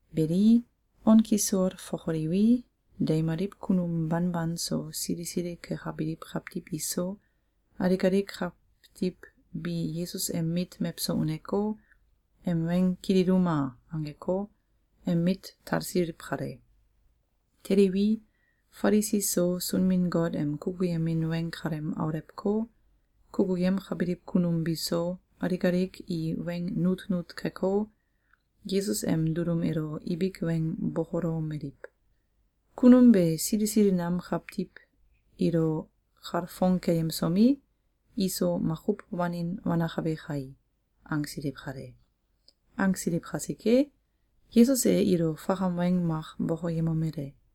Beli, on kisol fokoliwi, deimaliw kunum banban so, sili sili kekabiliw kawtiw iso, alik alik kawtiw bi ‘Yesus em mit mewso uneko, em weng kililuma!’, angeko, em mit talsiliw kale. Teliwi, Falisi so, Sunbin-Got em kukuyemin weng kalem aulewko, kukuyemkabiliw kunum biso, alik alik i weng nutnut keko, Yesus em dulum elo ibik weng bokolomeliw: “Kunum be sili sili nam kawtiw ilo kalfong keyemsomi, iso makuw wanin wanakabe kai!”, angsiliw kale. Angsiliw kasike, Yesus e ilo fakam weng mak bokoyemomele: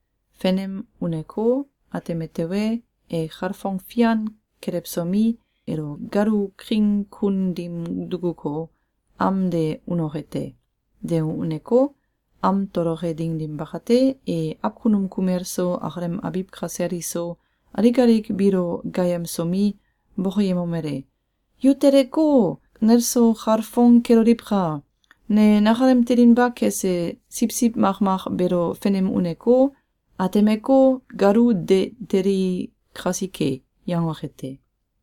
Fenem uneko, ateme tewe, e kalfong fian kelewsomi, elo galu king kun dim dukuko, am de unoke te. De uneko, am toloke ding dim bakate, e awkunum kumel so, akalem abiw kasel iso, alik alik biilo gaayemsomi, bokoyemomele: ‘Yu teleko, neso kalfong keloliwka! Ne nakalem telinba kese siwsiw makmak beelo fenem uneko, atemeko, galu de teli kasike!’, yangoke te.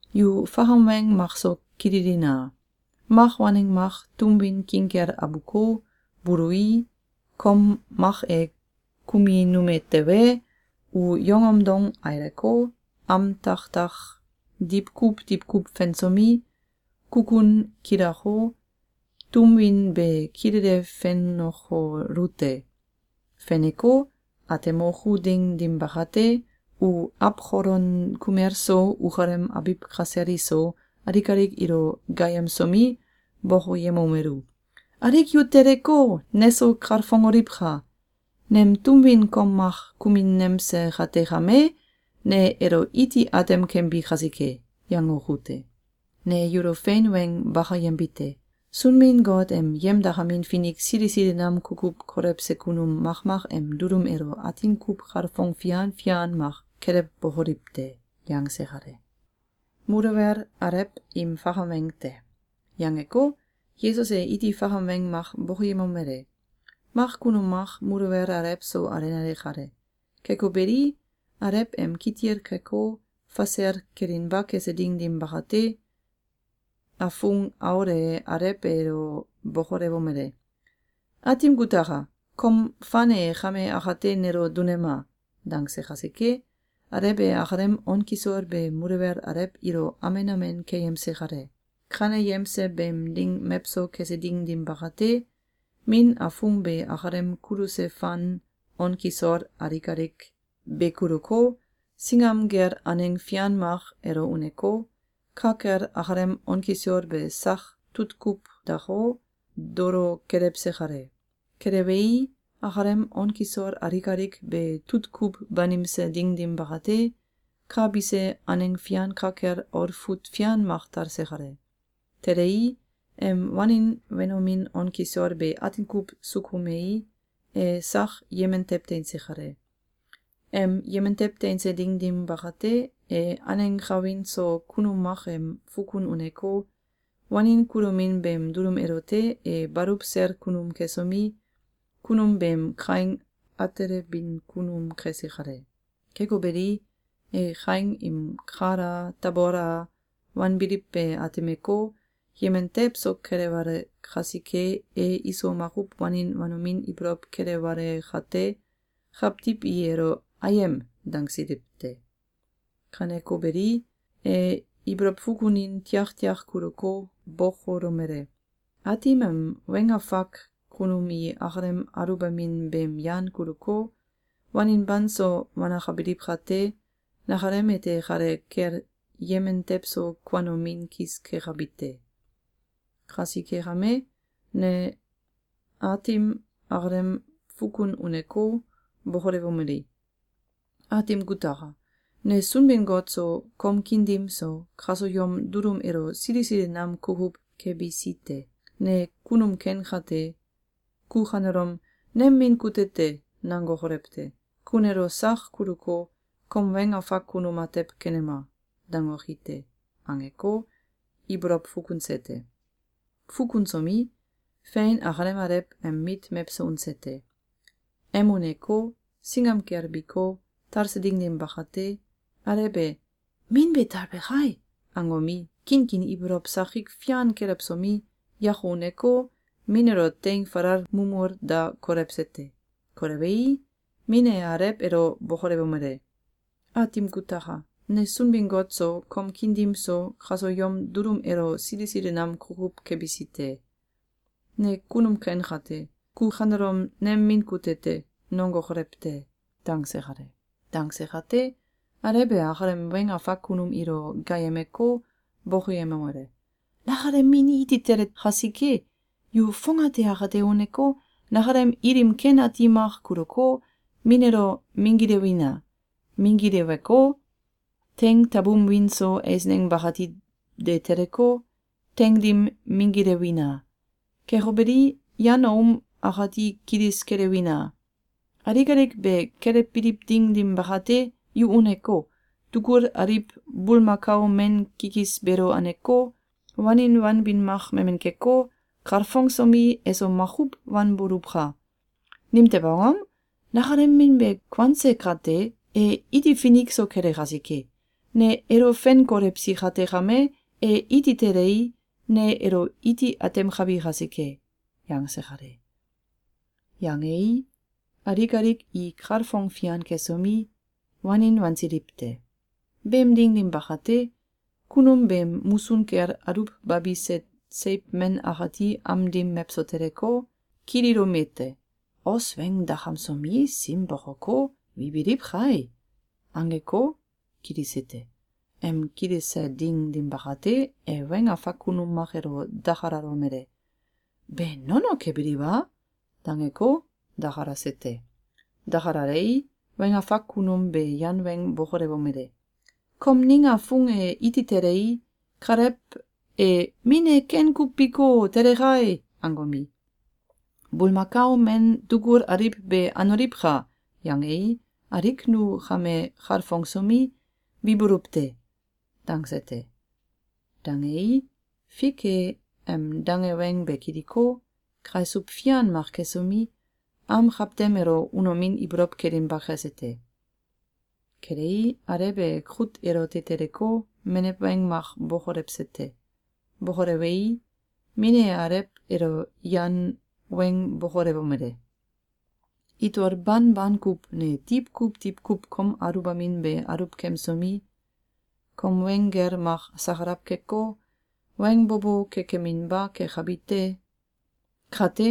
Yu fakam weng makso kililina! Mak waneng mak tum win king kel abuko, bului, kom mak e kuminume tewe, u yongom dong aileko, am taktak diwkuw diwkuw fensomi, kukun kilako, tum win be kilele fenokolu te. Feneko, atemoku ding dim bakate, u awkolon kumel so, ukalem abiw kasel iso, alik alik ilo gaayemsomi, bokoyemomelu: ‘Alik yu teleko, neso kalfongoliwka! Nem tum win kom mak kuminemse kate kame, ne elo iti atem kembi kasike!’, yangoku te. Ne yulo fein weng bakayembite: Sunbin-Got em yemdakamin finik sili sili nam kukuw kolewse kunum makmak em dulum elo atin kuw kalfong fian fian mak kelewbokoliw te.”, yangse kale. Muluwel Alew im Fakam Weng te. Yangeko, Yesus e iti fakam weng mak bokoyemomele: “Mak kunum mak muluwel alew so alenale kale. Keko beli, alew em kitil keko, fasel kelinba kese ding dim bakate, afung aul e alew elo bokolewomele: ‘Aatim kutaka! Kom fan e kame akate nelo dunema!’, dangse kasike, alew e akalem on kisol be muluwel alew ilo amen amen keyemse kale. Kaneyemse beem ding mewso kese ding dim bakate, min afung be akalem kuluse fan on kisol alik alik be kuluko, singam kel aneng fian mak elo uneko, ka kel akalem on kisol be sak tutkuw dako, dolo kelewse kale. Kelewei, akalem on kisol alik alik be tutkuw banimse ding dim bakate, ka bise aneng fian ka kel olfut fian mak talse kale. Telei, em wanin wenomin on kisol be atin kuw sukumei, e sak yemen tew teinse kale. Em yemen tew teinse ding dim bakate, e aneng kawin so kunum mak em fukun uneko, wanin kulomin beem dulum elote e baluw sel kunum kesomi, kunum beem kaing atelebin kunum kese kale. Keko beli, e kaing im kal a, tabol a, wanbiliw be atemeko, yemen tewso kelewale kasike, e iso makuw wanin wanomin ibolow kelewale kate, kawtiw i elo ‘Ayem!’, dangsiliw te. Kaneko beli, e ibolow fukunin tiaktiak kuluko, bokolomele: ‘Aatim em weng afak kunum i ikalem aluwbamin beem yan kuluko, wanin banso wanakabiliw kate, nakalem ete kale kel yemen tewso kuanomin kis kekabi te. Kasike kame, ne aatim akalem fukun uneko, bokolewomeli: ‘Aatim kutaka! Ne Sunbin-Got so, kom kiin dim so, kaso yom dulum elo sili sili nam kukuw kebisi te! Ne kunum ken kate, ku kanelom ‘Nem min kute te!’, nangokolew te! Ku nelo sak kuluko, kom weng afak kunum atew kenema!’, dangoki te.’, angeko, ibolow fukunse te. Fukunsomi, fein akalem alew em mit mewso unse te. Em uneko, singam kel biko, talse ding dim bakate, alew e ‘Min be talbe kai!’, angomi, kinkin ibolow sakik fian kelewsomi, yako uneko, min elo teing falal mumul da kolewse te. Kolewei, min e alew elo bokolewomele: ‘Aatim kutaka! Ne Sunbin-Got so, kom kiin dim so, kaso yom dulum elo sili sili nam kukuw kebisi te! Ne kunum ken kate, ku kanelom ‘Nem min kute te!’, nongokolew te!’, dangse kale. Dangse kate, alew e akalem weng afak kunum ilo gaayemeko, bokoyemomele: ‘Nakalem min iti tele kasike, yu fongate akate uneko, nakalem ilim ken ati mak kuluko, min elo minggilewina! Minggileweko, teing tabum wiin so eisneng bakati de teleko, teing dim minggilewina! Keko beli, yan aum akati kilis kelewina! Alik alik be kelewbiliw ding dim bakate, yu uneko, tugul aliw bulmakao men kikis beelo aneko, wanin wanbin mak memen keko, kalfongsomi, eso makuw wanboluwka! Nimtew angom? Nakalem min be kuanse kate, e iti finik so kele kasike! Ne elo fen kolewsi kate kame, e iti telei, ne elo iti atemkabi kasike!’, yangse kale. Yangei, alik alik i kalfong fian kesomi, wanin wansiliw te. Beem ding dim bakate, kunum beem musun kel aluwbabise seiw men akati am dim mewso teleko, kililomete: ‘Os weng dakamsomi, sim bokoko, wibiliw kai!’, angeko, kilise te. Em kilise ding dim bakate, e weng afak kunum mak elo dakalalomele: ‘Be nono kebiliw a?’, dangeko, dakalase te. Dakalalei, weng afak kunum be yan weng bokolewomele: ‘Kom ning afung e iti telei, kalew e ‘Min e ken kuw biko, tele kai!’, angomi, ‘Bulmakao men tugul aliw be anoliwka!’, yangei, alik nu kame kalfongsomi, wibuluw te.’, dangse te. Dangei, fik e em dange weng be kiliko, kaisuw fian mak kesomi, am kawtem elo unomin ibolow kelinba kese te. Kelei, alew e kut elote teleko, menew weng mak bokolewse te. Bokolewei, min e alew elo yan weng bokolewomele: ‘Itol banban kuw ne diwkuw diwkuw kom aluwbamin be aluwkemsomi, kom weng gel mak sakalaw keko, weng bo bo kekeminba kekabi te. Kate,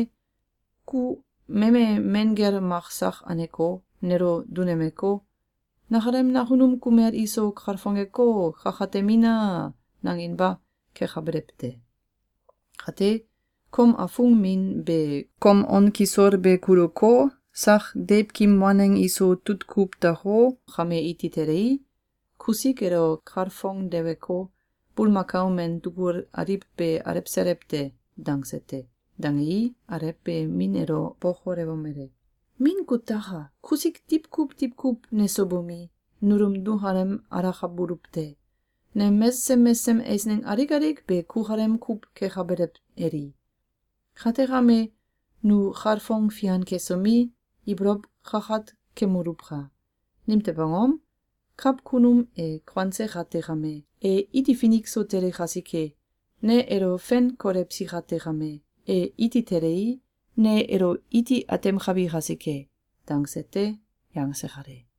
ku meme men gel mak sak aneko, nelo dunemeko, ‘Nakalem nakunum kumel iso kalfongeko, kakatemina!’, nanginba kekabelew te. Kate, kom afung min be kom on kisol be kuluko, sak deiwkim waneng iso tutkuw dako, kame iti telei, kusik elo kalfongdeweko, bulmakao men tugul aliw be alewselew te.’, dangse te. Dangei, alew be min elo bokolewomele: ‘Min kutaka! Kusik diwkuw diwkuw neso bomi, nulum nukalem alakabuluw te. Nem mesesem mesesem eisneng alik alik be kukalem kuw kekabelew eli. Kate kame, nu kalfong fian kesomi, ibolow kakat kemoluwka! Nimtew angom? Kawkunum e kuanse kate kame, e iti finik so tele kasike. Ne elo fen kolewsi kate kame, e iti telei, ne elo iti atemkabi kasike!’, dangse te.”, yangse kale.